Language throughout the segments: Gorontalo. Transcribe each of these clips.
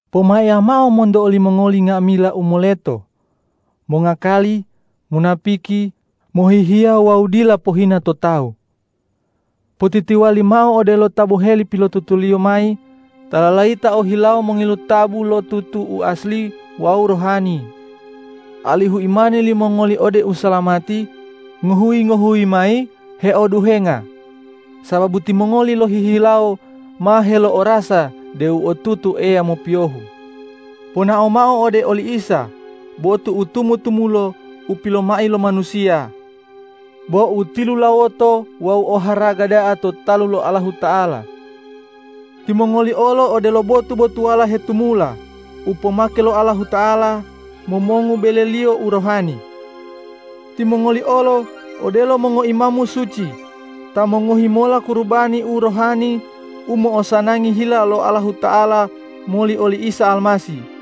Pomaiya mao monto olimongoli nga'amila u moleto, mongakaliya, munapiki, mohihiya wawu dila pohina to tawu. Potitiwali mao odelo ta boheli pilotutuliyo mayi ta lalayita ohilawo mongilu tabu lo tutu u asli wawu rohani, alihu imani limongoli ode usalamati ngohuyi-ngohuyi mayi heoduhenga sababu timongoli lohihilawo ma helo'orasa deu otutu Eya mopiyohu. Ponao mao ode oli Isa botu u tumu-tumulo u pilomai lo manusiya, bo u tilulawoto wawu u oharaga da'a to talu lo Allahuta'ala. Timongoli olo odelo botu-botuwala hetumula u pomake lo Allahuta'ala momongu bele-Liyo u rohani. Timongoli olo odelo mongoimamu suci ta mongohi mola kurubani u rohani u mo'osanangi hila lo Allahuta'ala moli oli Isa Almasih.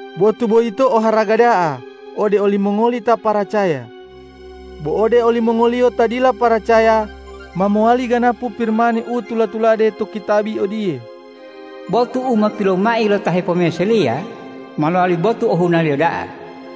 Botu boyito oharaga da'a ode olimongoli ta paracaya. Bo ode olimongoliyo ta dila paracaya, ma mowali ganapu Pirimani u tula-tulade to kitabi odiye,”Botu u ma pilomai lo ta hepomeseliya ma lowali botu ohunaliyo da'a.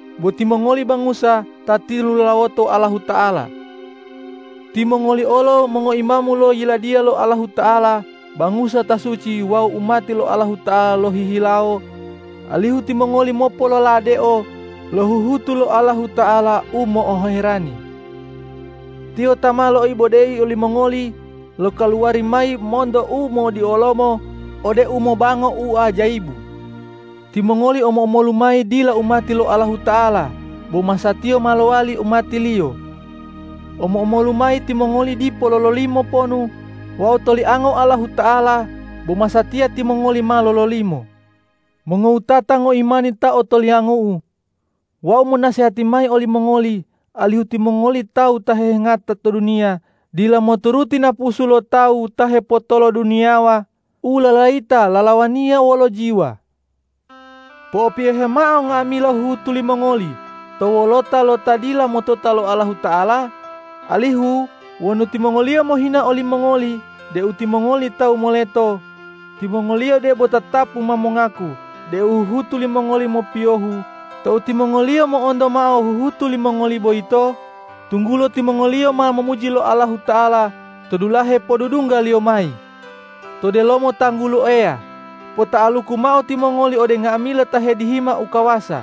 Bo timongoli bangusa ta tilulawoto Allahuta'ala. Timongoli olo mongoimamu lo Yiladiya lo Allahuta'ala, bangusa ta suci wawu umati lo Allahuta'ala lohihilawo, alihu timongoli mopololadeo lo huhutu lo Allahuta'ala u mo'oherani. Tiyo ta ma loibodeyi olimongoli lokaluwari mayi monto umodiolomo ode umobango u ajayibu. Timongoli omo-omolu mayi dila umati lo Allahuta'ala, bo masatiya ma lowali umati-Liyo. Omo-omolu mayi timongoli dipo lololimo ponu wawu toliango Allahuta'ala, bo masatiya timongoli ma lololimo. Mongowutata ngoimani ta otoliangu'u, wau monasehati mayi olimongoli alihu timongoli tawu ta hehangata to duniya dila moturuti napusu lo tawu ta hepotoloduniyawa u lalayita lalawaniya wolo jiwa. Po'opiyohe mao nga'amila huhutu limongoli to wolota lo ta dila motota lo Allahuta'ala, alihu wonu timongoliyo mohina olimongoli deu timongoli tawu moleto, timongoliyo debo tatapu ma mongaku deu huhutu limongoli mopiyohu tou timongoliyo mo'onto mao huhutu limongoli boyito, tunggulo timongoliyo ma momuji Allahuta'ala to dulahe podudungga-Liyo mayi. To delomo tanggulo Eya, pota'aluku mao timongoli ode nga'amila ta hedihima ukawasa,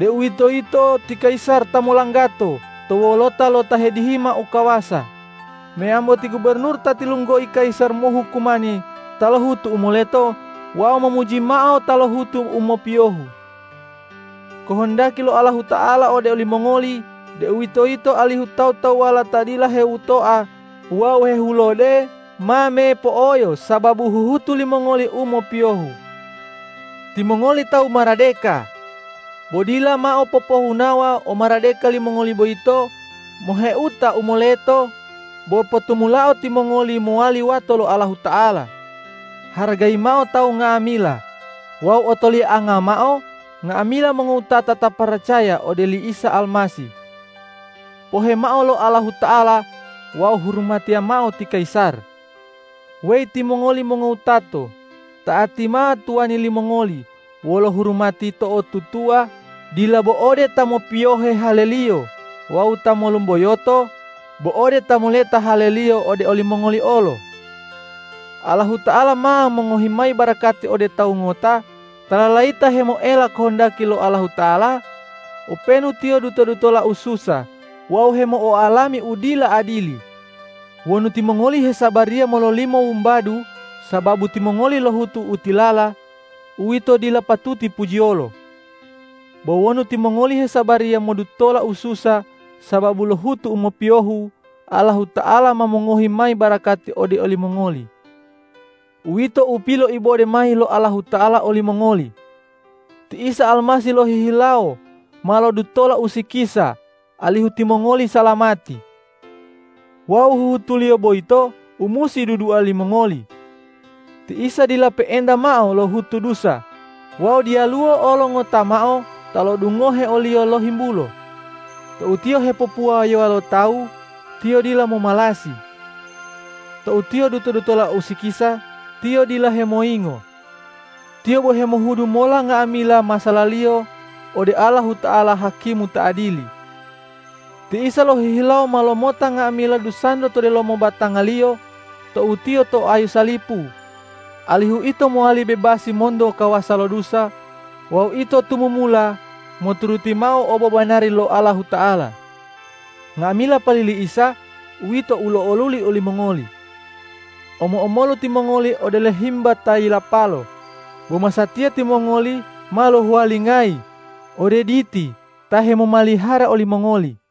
deuwitoyito ti kayisar ta molanggato to wolota lo ta hedihima ukawasa meyambo ti gubornur ta tilunggoi kayisar mohukumani ta lohutu u moleto wawu momuji mao ta lohutu u mopiyohu. Kohondaki lo Allahuta'ala ode olimongoli, deuwitoyito alihu tawu-tawuwala ta dila heowutoa wawu hehulode ma mepo'oyo sababu huhutu limongoli u mopiyohu. Timongoli tawu maradeka. Bo dila mao popohunawa omaradeka limongoli boyito moheuta u moleto, bo potumulao timongoli mowali wato lo Allahuta'ala. Haragayi mao tawu nga'amila wawu otolianga mao nga'amila mongowutata ta paracaya ode oli Isa Almasih. Pohe mao lo Allahuta'ala wawu hurumatiya mao ti kayisar. Weyi timongoli mongowato, ta'ati mao tuwani limongoli wolo hurumati to'otutuwa, dila bo ode ta mopiyohe haleliyo wawu ta molumboyoto, bo ode ta moleta haleliyo ode olimongoli olo. Allahuta'ala ma mongohi mayi barakati ode tawu ngota ta lalayita hemoela kohondaki lo Allahuta'ala, openu tiyo duto-dutola ususa wawu hemo'oalami u dila adili. Wonu timongoli hesabariya mololimo wumbadu sababu timongoli lohutu u tilala, uwito dila patuti pujiyolo. Bo wonu timongoli hesabariya modutola ususa sababu lohutu u mopiyohu, Allahuta'ala ma mongohi mayi barakati ode olimongoli. Uwito u piloibode mayi lo Allahuta'ala olimongoli. Ti Isa Almasih lohihilawo ma lodutola usikisa alihu timongoli salamati. Wawu huhutu-Liyo boyito u musi dudua limongoli. Ti Isa dila pe'enta mao lohutu dusa wawu diyaluwo olo ngota mao ta lo'odungohe o-Liyo lohimbulo. Tou Tiyo hepopuwayowa lo tawu, Tiyo dila momalasi. Tou Tiyo duto-dutola usikisa, Tiyo dila hemoyingo. Tiyo bo hemohudu mola nga'amila masa'ala-Liyo ode Allahuta'ala hakimu ta adili. Ti Isa lohihilawo ma lomota nga'amila dusanto to delomo batanga-Liyo tou Tiyo to ayu salipu, alihu ito mowali bebasi monto kawasa lo dusa wawu ito tumumula moturuti mao obobanari lo Allahuta'ala. Nga'amila pali li Isa, uwito u lo'oluli olimongoli. Omo-omolu timongoli odelo himba ta yilapalo, bo masatiya timongoli ma lohuwalingayi ode Diti ta hemomalihara olimongoli.